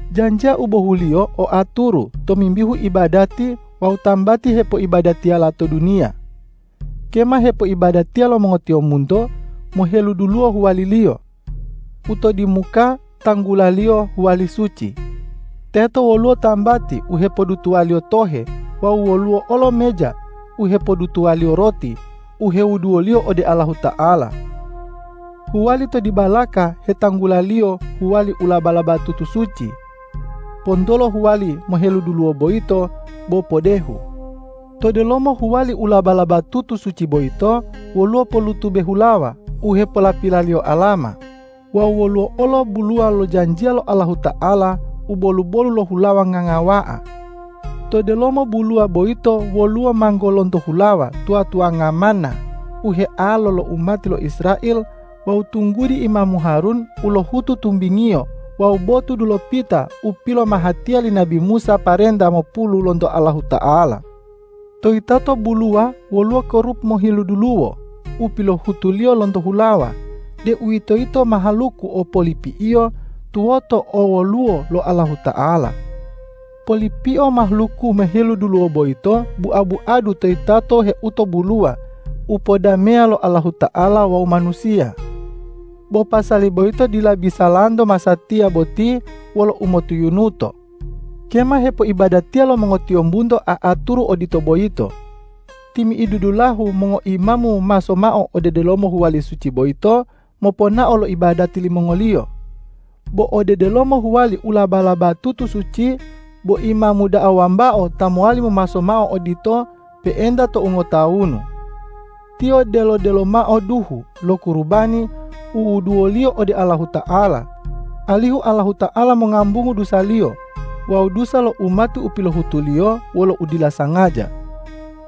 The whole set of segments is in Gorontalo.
Janjiya u bohuliyo o aturu tomimbihu ibadati wawu tambati hepoibadatiyala to duniya. Kema hepoibadatiya lo mongotiyombunto moheluduluwo huwaliliyo. U to dimuka tanggulaliyo huwali suci. Teto woluwo tambati u hepodutuwaliyo tohe wawu woluwo olo meja u hepodutuwaliyo roti u hewuduwoliyo ode Allahuta'ala. Huwali to dibalaka hetanggulaliyo huwali u laba-labatutu suci. Pontolo huwali moheluduluwo boyito bo podehu. To delomo huwali u laba-labatutu suci boyito, woluwo pollutube hulawa u hepolapilaliyo alama wawu woluwo olo buluwa lo janjiya lo Allahuta'ala u bolu-bolu lo hulawa ngangawa'a. To delomo buluwa boyito woluwo manggo lonto hulawa tuwa-tuwanga manna u healo lo umati lo Israel wawu tunggudi imamu Harun u lohutu tumbingiyo wawu botu dulopita u pilomahatiya li nabi Musa parenta mopulu lonto Allahuta'ala. To yitato buluwa woluwo kerub moheluduluwo u pilohutuliyo lonto hulawa, deuwitoyito mahaluku o polipi'iyo tuwoto owoluwo lo Allahuta'ala. Polipio mahaluku moheluduluwo boyito bua-buadu toyitato heuto buluwa u podameya lo Allahuta'ala wawu manusiya. Bo pasali boyito dila bisalanto masatiya boti wolo umotuyunuto. Kema hepoibadatiya lo mongotiyombunto a'aturu odito boyito. Timi'idu dulahu mongoimamu momaso mao ode delomo huwali suci boyito, moponao lo ibadati limongoliyo. Bo ode delomo huwali u laba-labatutu suci, bo imamu da'a wambao ta mowali momaso mao odito pe'enta tou ngotawunu. Tiyo delo-delo mao duhu lo kurubani u wuduwoliyo ode Allahuta'ala, alihu Allahuta'ala mongambungu dusaliyo wawu dusa lo umati u pilohutuliyo wolo udila sangaja.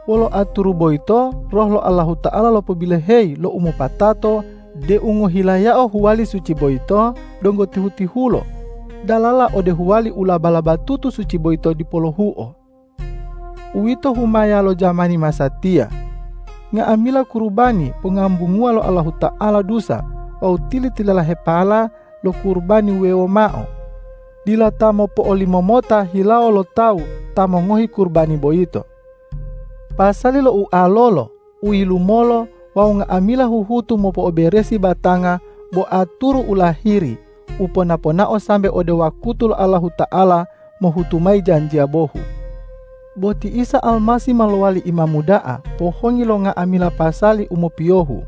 Wolo aturu boyito Roh lo Allahuta'ala lopobiloheyi lo umopatato deu ngohilayao huwali suci boyito donggo tihu-tihulo, dalala ode huwali u laba-labatutu suci boyito dipo lohuo. Uwito humaya lo jamani masatiya. Nga'amila kurubani pongambunguwa lo Allahuta'ala dusa wawu tili-tililahepala lo kurubani wuwewo mao, dila ta mopo'olimomota hilawo lo tawu ta mongohi kurubani boyito. Pasali lo ualolo, uyilumolo wawu nga'amila huhutu mopo'oberesi batanga bo aturu u lahiri u pona-ponao sambe ode wakutu lo Allahuta'ala mohutu mayi janjiya bohu. Bo ti Isa Almasih ma lowali Imamu da'a pohongi lo nga'amila pasali u mopiyohu.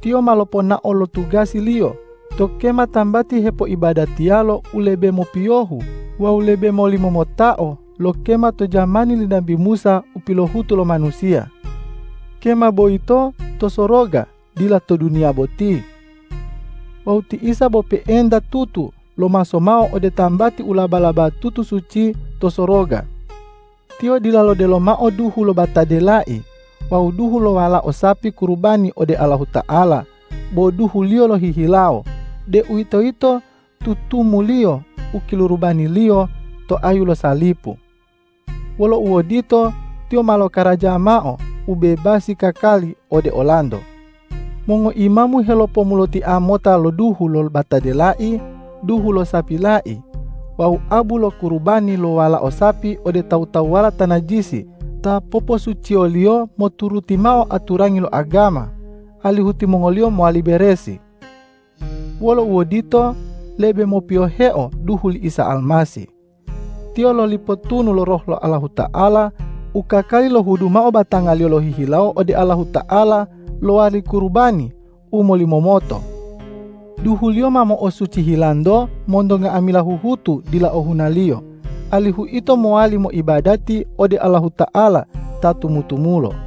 Tiyo ma loponao lo tugasi-Liyo to kema tambati hepoibadatiyalo u lebe mopiyohu wawu lebe molimomotao lo kema to jamani li nabi Musa u pilohutu lo manusiya. Kema boyito to soroga, dila to duniya boti. Wawu ti Isa bo pe'enta tutu lomaso mao ode tambati u laba-labatutu suci to soroga. Tiyo dila lodelo mao duhu lo batade lai wawu duhu lo walao sapi kurubani ode Allahuta'ala, bo duhu-Liyo lohihilawo, deuwitoyito tutumu-Liyo u kilorobani-Liyo to ayu salipu. Wolo uodito, Tiyo ma lokaraja mao ubebasi kakali ode olanto. Mongoimamu helopomulotia mota lo duhu lo batade lai, duhu lo sapi lai wawu abu lo kurubani lo walao sapi ode tawu-tawuwala ta najisi ta poposuciyoliyo moturuti mao aturangi lo agama, alihu timongoliyo mowali beresi. Wolo uodito, lebe mopiyoheo duhu li Isa Almasih. Tiyo loli potunu lo Roh lo Allahuta'ala u kakali lohudu mao batanga-Liyo lohihilawo ode Allahuta'ala lowali kurubani u molimomoto. Duhu-Liyo ma mo'osuci hilanto monto nga'amila huhutu dila ohunaliyo, alihu ito mowali moibadati ode Allahuta'ala ta tumu-tumulo.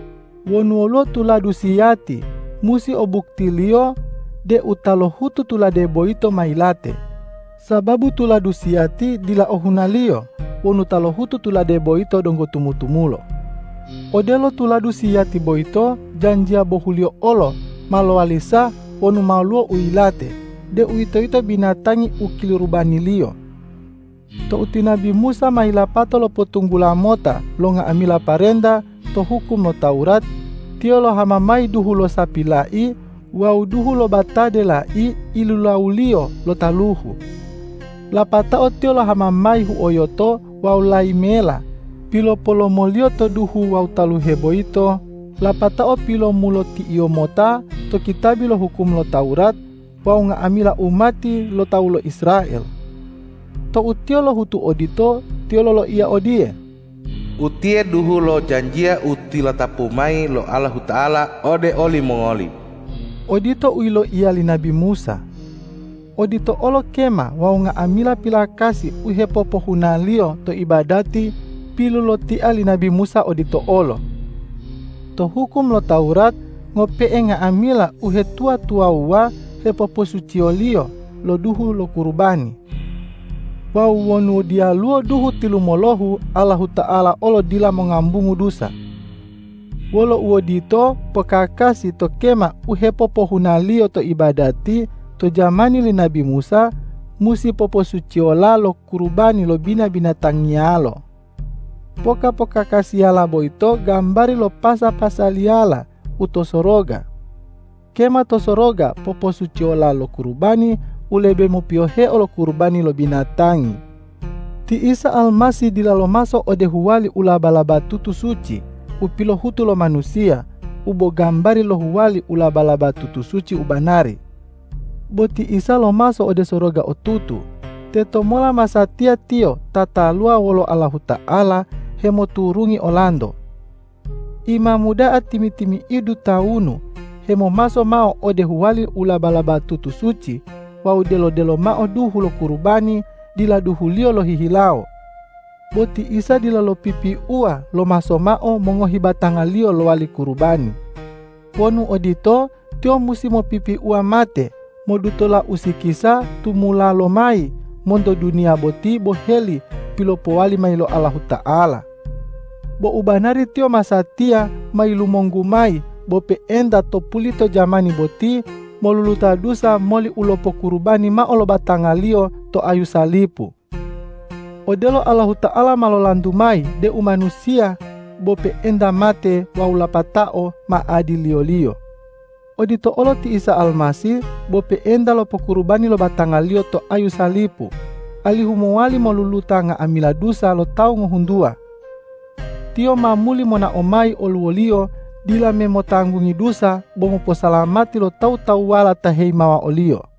Wonu woluwo tuladu siyati, musi o buktiliyo deu ta lohutu tulade boyito ma yilate, sababu tuladu siyati dila ohunaliyo wonu ta lohutu tulade boyito donggo tumu-tumulo. Odelo tuladu siyati boyito, janjiya bohuliyo olo ma lowali sah wonu ma woluwo u yilate, deuwitoyito binatangi u kilorobaniliyo. Tou ti nabi Musa ma yilapato lopotunggula mota lo nga'amila parenta to hukum lo Tawurat, tiyo lohama mayi duhu lo sapi lai wawu duhu lo batade lai ilulawuliyo lo taluhu. Lapatao tiyo lohama mayi huoyoto wawu layi mela pilopolomoliyo to duhu wawu taluhe boyito, lapatao pilomuloti'iyo mota to kitabi lo hukum lo Tawurat wawu nga'amila umati lo tawu lo Israel. Tou tiyo lohutu odito, tiyo loloiya odiye,”Utiye duhu lo janjiya u tilatapu mayi lo Allahuta'ala ode olimongoli.” Odito u yiloiya li nabi Musa. Odito olo kema wawu nga'amila pilakasi u hepopohunaliyo to ibadati pilulotia li nabi Musa odito olo. To hukum lo Tawurat ngope'e nga'amila uhetuwa-tuwawuwa hepoposuciyoliyo lo duhu lo kurubani. Wawu wonu diyaluwo duhu tilumolohu, Allahuta'ala olo dila mongambungu dusa. Wolo uodito, pokakasi to kema u hepopohunaliyo to ibadati to jamani li nabi Musa, musi poposuciyola lo kurubani lo bina-binatangiyalo. Poka-pokakasiyala boyito gambari lo pasa-pasaliyala u to soroga. Kema to soroga poposuciyola lo kurubani u lebe mopiyoheo lo kurubani lo binatangi. Ti Isa Almasih dila lomaso ode huwali u laba-labatutu suci u pilohutu lo manusiya u bo gambari lo huwali u laba-labatutu suci u banari. Bo ti Isa lomaso ode soroga otutu, tetomola masatiya Tiyo tataluwa wolo Allahuta'ala hemoturungi olanto. Imamu da'a timi-timi'idu tawunu hemomaso mao ode huwali u laba-labatutu suci wawu delo-delo mao duhu lo kurubani dila duhuliyo lohihilawo. Bo ti Isa dila lopipiuwa lomaso mao mongohi batanga-Liyo lowali kurubani. Wonu odito, Tiyo musi mopipiuwa mate modutola usikisa tumula lomayi monto duniya boti boheli pilopowali mayi lo Allahuta'ala. Bo u banari Tiyo masatiya ma yilumonggu mayi bo pe'enta to pulito jamani boti moluluta dusa moli u lopokurubani mao lo batanga-Liyo to ayu salipu. Odelo Allahuta'ala ma lolantu mayi deu manusiya bo pe'enta mate wawu lapatao ma adiliyo-Liyo; odito olo ti Isa Almasih bo pe'enta lopokurubani lo batanga-Liyo to ayu salipu, alihu mowali moluluta nga'amila dusa lo tawu ngohuntuwa. Tiyo ma muli monao mayi oluwoliyo dila me motanggungi dusa, bo moposalamati lo tawu-tawuwala ta heyimawa o-Liyo.